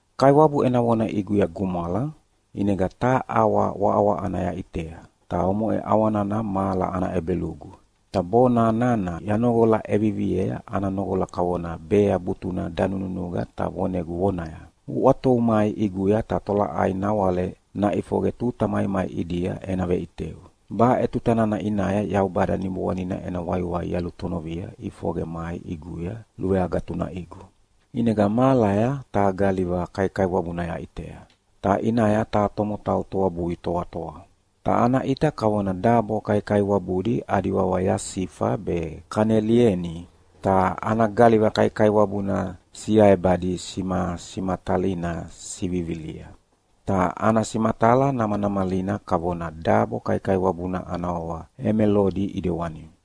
Kaiwabu ena vona ʼiguya gumwala, ʼinega taha ʼawa waʼawaʼana yaʼitea, ta omoʼe ʼawa nana mahala ana ʼebelugu. Ta bona nana yanoqola ʼeviviea ana noqola kavona bea butuna danununuqa ta vonegu vonaya, “Uʼwatovu mai ʼiguya ta tolaʼai nawale naʼifoqe tuta maimai ʼidia ena veʼiteu.” Baʼe tuta nana ʼinaya Yaubada Niboanina ena waiwai yalutonovia ʼifoqe mai ʼiguya luveagatunaʼigu, ʼinega mahalaya taha galiva kaikaiwabuna yaʼitea, ta ʼinaya taha tomotau toabui toatoa. Ta ana ʼita kavona dabo kaikaiwabudi adi wawa yasifa be kanelieni, ta ana galiva kaikaiwabuna siaebadi simasimatalina sivivilia, ta ana simatala namanamalina kavona dabo kaikaiwabuna ana wawa emelodi ʼidewani.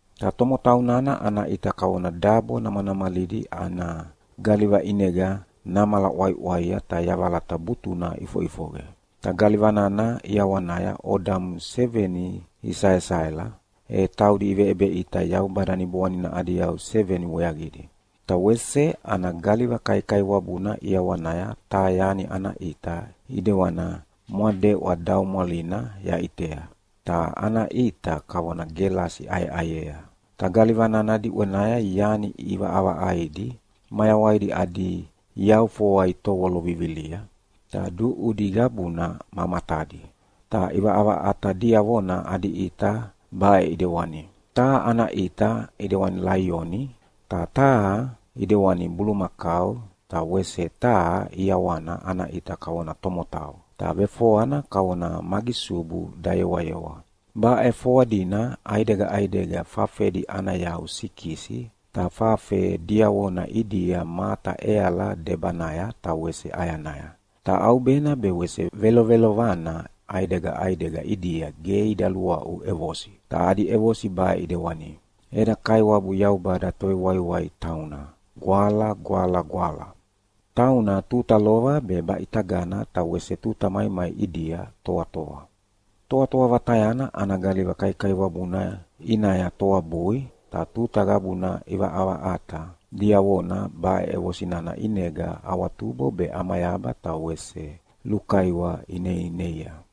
Ta tomotau nana ana ʼita kavona dabo namanamalidi ana galiva ʼinega namala ʼwaiʼwaia ta yavalata butuna ʼifoʼifoqe. Ta galiva nana ʼiawanaya odamu seveni isaesaela, e taudi iveʼebeʼita Yaubada Niboanina adi yau seveni weaqidi. Ta wese ana galiva kaikaiwabuna ʼiawanaya taha yani ana ʼita ʼidewana mwadeʼwa daumwalina yaʼitea, ta ana ʼita kavona gelasi ʼayeʼayea. Ta galiva nana diʼwenaya yani ʼivaʼavaʼaidi mayawaidi adi yau foa itovolo vivilia, ta duʼudi qabuna ma matadi. Ta ʼivaʼavaʼata diavona adi ʼita baʼe ʼidewani: Taha ana ʼita ʼidewani laioni, ta taha ʼidewani bulumakau, ta wese taha ʼiawana ana ʼita kavona tomotau, ta vefoana kavona magisubu dayewayewa. Baʼe foadina ʼaidega ʼaidega fafedi ana yau sikisi, ta fafe diavona ʼidia mata ʼeala debanaya ta wese ʼayanaya. Ta ʼaubena be wese velovelovana ʼaidega ʼaidega ʼidia ge ida luaʼu ʼevosi, ta adi ʼevosi baʼe ʼidewani: “Eda Kaiwabu Yaubada Tovewaiwai tauna Gwala, Gwala, Gwala. Tauna tuta lova, be baʼitagana, ta wese tuta maimai ʼidia toatoa.” Toatoa Vatayana ana galiva kaikaiwabuna ʼinaya toabui, ta tuta qabuna ʼivaʼavaʼata diavona baʼe ʼevosi nana ʼinega awatubo be ʼamayaba ta wese lukaiwa ineineia.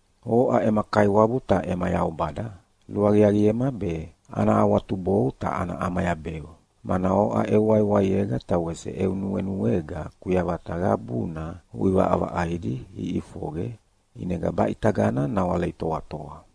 “Oʼa ema Kaiwabu ta ema Yaubada luaqiaqiema be ana awatubou ta ana ʼamayabeu, mana oʼa eu waiwaiega ta wese eu nuenuega kuyavata qabuna uʼivaʼavaʼaidi iʼifoqe, ʼinega baʼitagana nawale itoatoa.”